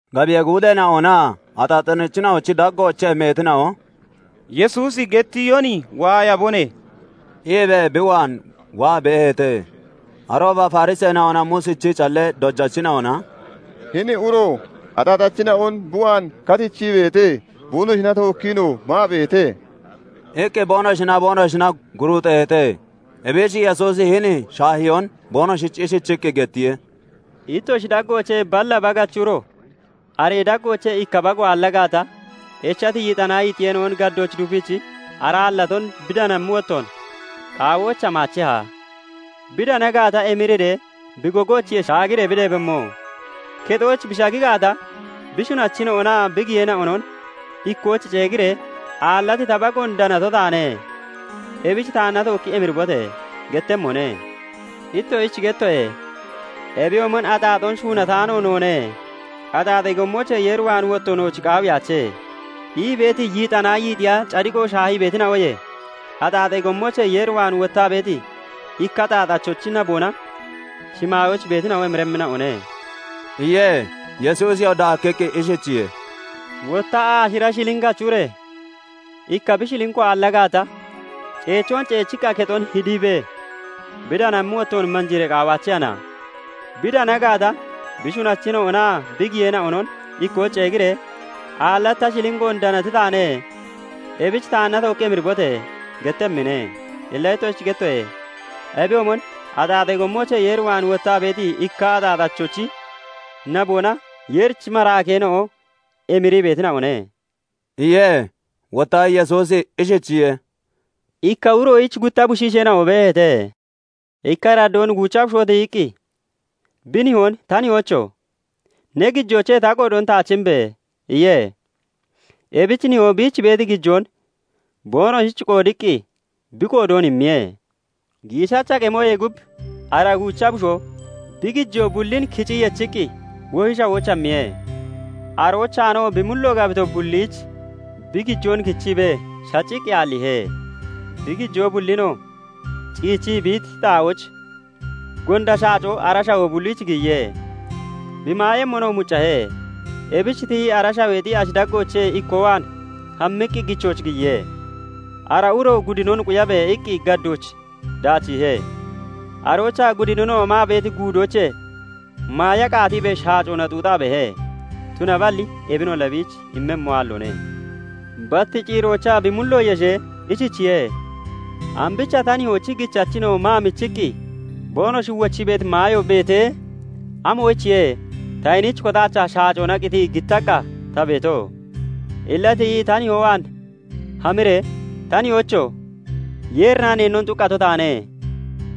Gabiyee guudeena'onaa axaaxachina'onochi daggoochee meetina'o "Yesuusi gettiyon waayabone" iibee bi waan waa beeheete. Arooba Fariseena'onaa Muusichi callee dojachina'ona "Hini uro axaaxachina'on bi waan katichii beete; boonoshina tookkiinoo maa beete" iqqi boonoshinaa boonoshina guruuxeeheete. Ebich Yesuusi hini shaahiyoon boonoshich ishichiqqi gettiye; "Ittoshi daggoochee balla bagachi uro, aree daggoochee ikka bago aalla gaata, echati yixanaa yiixiyeena'on gaddooch dupiichii ara aallaton bi danammi wottoon qaawooich hamaacheha? Bi dana gaata, emiriree bi gogoochiye shaagiree bi deebemmo; kexooch bi shagi gaata, bi shunachina'onaa bi giyeena'onon ikkooch ceegiree, 'Aallati ta bagoon danato taane; ebich taanna tookki emiribote!' gettemmone. Ittoshich gettoye; ebiyoomon 'Axaaxoon shuunataano noone; axaaxee gommoochee Yeer waan wotto nooch qaawiyaache' ii beeti yixanaa yiixiya cadiqo shaahii beetina'oye, axaaxee gommoochee Yeer waan wottaa beeti ikka axaaxachochi naboona shimaayooch beetina'o emiremmina'one" iye. Yesuusiyoo daakkiqqi ishichiye:- "Wotta aashira shilinkachi ure ikka bi shilinko aalla gaata, ceechoon ceechiqqa kexon hidiibee bi danammi wottoon manjiiree qaawaachehana? Bi dana gaata, bi shunachina'onaa bi giyeena'onon ikkooch ceegiree, 'Aallati ta shilinkoon danati taane; ebich taanna tookki emiribote!' gettemmine. Illa ittoshich gettoye; ebiyoomon axaaxee gommoochee Yeer waan wottaa beeti ikkaa axaaxachochi naboona Yeerichi maraakeena'o emirii beetina'one" iye. Wotta Yesuusi ishichiye:- "Ikka uroyich gutta bushiisheena'o beeheete. Ikka araddoon guucha bushoo tiyiqqi bi nihoon 'Ta nihoocho! Ne gijoochee ta qoodoon taach imbe!' iye. Ebich nihoo biich beeti gijoon boonoshich qoodiqqi bi qoodoon immiye. "Giishacha qemoyee gub ara guucha bushoo bi gijoo bullin kicii yechiqqi wohi shawooch hammiye; aroochaanoo bi mullo gabito bulliich bi gijoon kichiibee shacciqqi aalliihe. Bi gijoo bullinoo ciichii bi iti xaa'ooch, gonda shaacoo ara shawoo bulliich giyiye; bi maayemmonoo muccahe. Ebich tiyii ara shaweexi ashi daggoochee ikkoo waan hammiqqi gichooch giyiye; ara uroo 'Gudinon quyabe!' iqqi gaddooch daachiihe. Aroochaa gudinina'o maa beeti guudoochee maaya qaatiibee shaacoona xuuxaa beehe; tunaballi ebinolla biich immemmo aalloone. "Bat ciiroochaa bi mullo yeshee, ishichiye:- 'Ambicha ta nihoochi gichachina'o maa michiqqi boonoshi wochii beeti maayo beetee, amoyichiye ta hiniich kotaachaa shaacona qitii gittaqqa ta beeto! Illa tiyi ta nihoo waan hamiree, "Ta nihoocho! Yeerinnaa neennon xuqqato taane;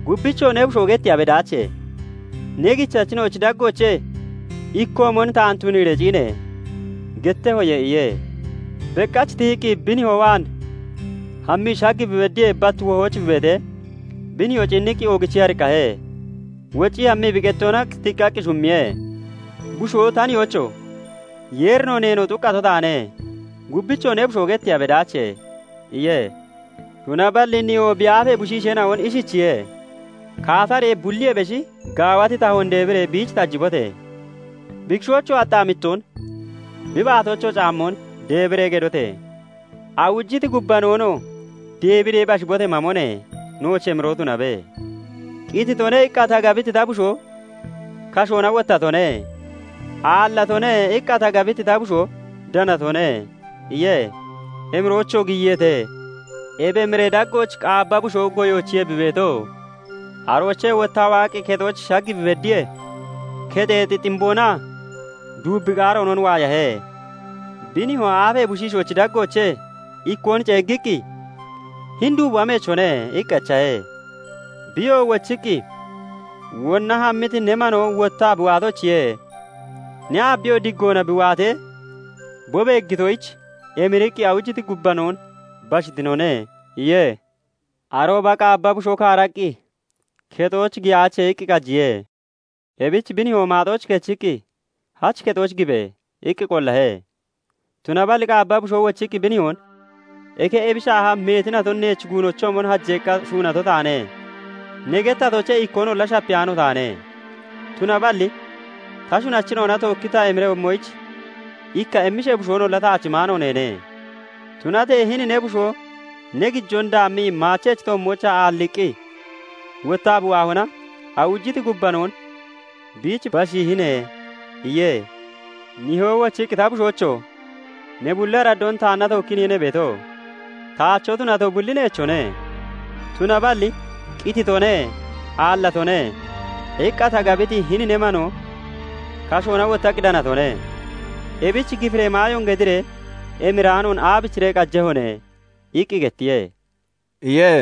gubbichoo ne bushoo getteeya bedaache; ne gichachina'ochi daggoochee ikkoomon taan tuniiree ciine!" gettehoye' iye. "Bekkach tiyiqqi bi nihoo waan hammii shag bi beddiyee, bat wohooch bi beetee, bi nihoo ciinniqqi oogichii ariqqahe; woccii hammii bi qettoona tiqqaqqi shummiye. "Bushoo 'Ta nihoocho! Yeerinoo neenoo xuqqato taane; gubbichoo ne bushoo getteeya bedaache' iye. "Tunaballi nihoo bi aafee bushiisheena'on ishichiye:- 'Kaataree bulliyee beshi gaawati tahoon deebiree biich tajibote! Bi kishoochoo axxaamittoon, bi baatoochoo caammoon deebiree gedote! Awujiti gubbanoonoo deebiree bashibote! Mamone! Nooch emiroo tunabe! "Qititone" iqqa ta gabiti ta bushoo kashoona wottatone; "Aallatone" iqqa ta gabiti ta bushoo danatone' iye. Emiroochoo giyiyeete. "Ebi emiree daggooch qaabba bushoo goyoochiye bi beeto; aroochee wottaa waaqqi kexooch shag bi beddiyee, kexeexi ximboonaa duubbi qaaroonon waayahe. Bi nihoo aafee bushiishoochi daggoochee ikkoon ceeggiqqi, 'Hini duubo ameechone?' iqqi echahe. "Biyoo wochiqqi, 'Wonna hammiti ne manoo wottaa bi waatoyichiye. Ne aabiyoo diggoona bi waatee bi beeggitoyich, emiriqqi awujiti gubbanoon bashiitone' iye. "Arooba qaabba bushoo kaaraqqi 'Kexooch giyaache' iqqi qajiye. "Ebich bi nihoo maaxooch kechiqqi, 'Hach kexooch gibe!' iqqi qollahe. "Tunaballi qaabba bushoo wochiqqi bi nihoon 'Eke ebi shaaha meeti naton neech guunochoomon hajeeqqa shuunato taane. Ne gettatoochee ikkoonolla shapiyaano taane; tunaballi ta shunachina'ona tookki ta emiremmoyich ikka emmishee bushoonolla taach imaano neene; Tunatee hini ne bushoo ne gijoon daammii maachee toommoochaa aalliiqqi wottaa bi waahona, awujiti gubbanoon biich bashiihine' iye. "Nihoo wochiqqi 'Ta bushoocho! Ne bulli araddoon taanna tookkiiniye ne beeto; taacho tunato bulli neechone. Tunaballi "Qititone; aallatone" iqqa ta gabiti hini ne manoo kashoona wottaqqi danatone; ebichi gifiree maayoon gediree emiraanoon aabichiree qajehone?' iqqi gettiye" iye.